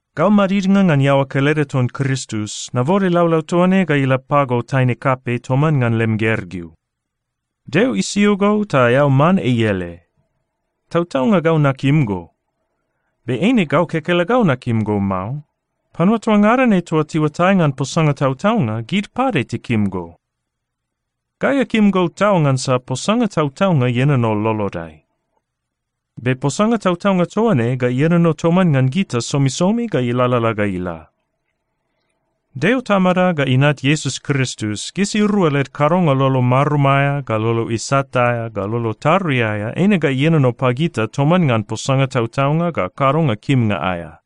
Gau madidnga ngan iaoa kelede ton Kristus, nabode laulau toa ne ga ila pago taine kapei toman ngan lem gergeu. Deo isio go ta eao man ei ele. Tautaunga gau nakim go. Be eine gau kekelegau nakim go mao. Panua toa ngada ne toa tiuatai ngan posanga tautaunga, gid pade tikim go. Gai akim go tau ngansa posanga tautaunga ienono lolodai. Be posanga tautaunga toa ne ga ienono toman ngan gita somisomi ga ilalala ga ila. Deo Tamada ga Inat Iesus Kristus, gisirua led kadonga lolo marum aea, ga lolo isat aea, ga lolo tarui aea eine ga ienono pagita toman ngan posanga tautaunga ga kadonga kimnga aea.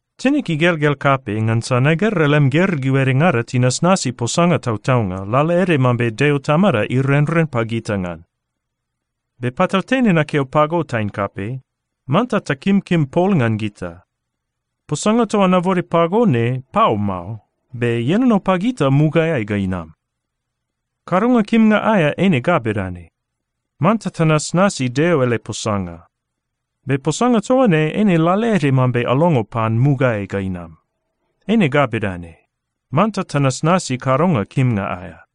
Tinig igelgel kapei ngansa nagera lem gergeu edengada tinasnasi posanga tautaunga, lalaede mambe Deo Tamada irenren pagita ngan. Be patautene nakeo pago, taine kapei, manta takimkim pol ngan gita. Posanga toa nabode pago ne pau mao, be ienono pagita mugaeai ga inam. Kadonga kimnga aea eine ga bedane: Manta tanasnasi Deo ele posanga. Be posanga toa ne eine lalaede mambe alongo pan mugaeai ga inam. Eine ga bedane: Manta tanasnasi kadonga kimnga aea.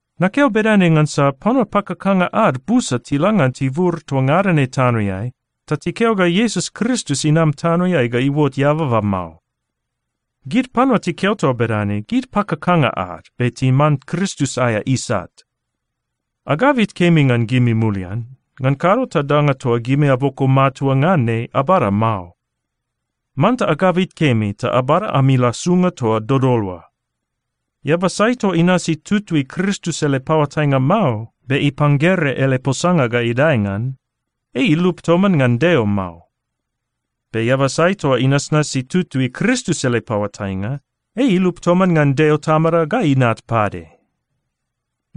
Nakeo bedane ngansa panua pakakanga ad busa tila ngan tibur toa ngada ne tanoeai, ta tikeo ga Iesus Kristus inam tanoeai ga iuot eababa mao. Gid panua tikeo toa bedane, gid pakakanga ad be timan Kristus aea isat. Agabit kemi ngan gimi mulian, ngan kado ta danga toa gimi aboko matua ngan ne, abada mao. Manta agabit kemi ta abada ami lasunga toa dodol oa. Eaba sai toa inasi tutui Kristus ele paoatainga mao, be ipanggere ele posanga ga idae ngan, ei ilup toman ngan Deo mao. Be eaba sai toa inasnasi tutui Kristus ele paoatainga, ei ilup toman ngan Deo Tamada ga Inat pade.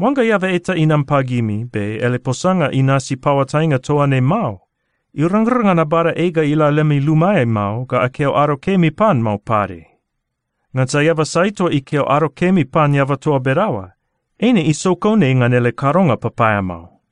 Oangga eaba eta inam pagimi be ele posanga inasi paoatainga toa ne mao, irangrang ngan abada ei ga ila lemi lumaeai mao ga akeo “ado kemi” pan mao pade. Ngansa eaba sai toa ikeo “ado kemi” pan eaba toa bedaoa, eine isokon ei ngan ele kadonga papaeamao.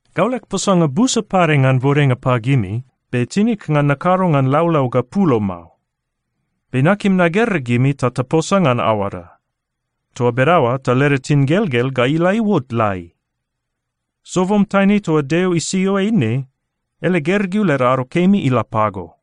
Gau leg posanga busa pade ngan bodenga pagimi, be tinig ngan nakado ngan laulau ga pulo mao. Be nakim nagera gimi ta taposa ngan aoada. Toa bedaoa ta leda tingelgel ga ila iuot lai. Sobom taine toa Deo isio ei ne, ele gergeu led ado kemi ila pago.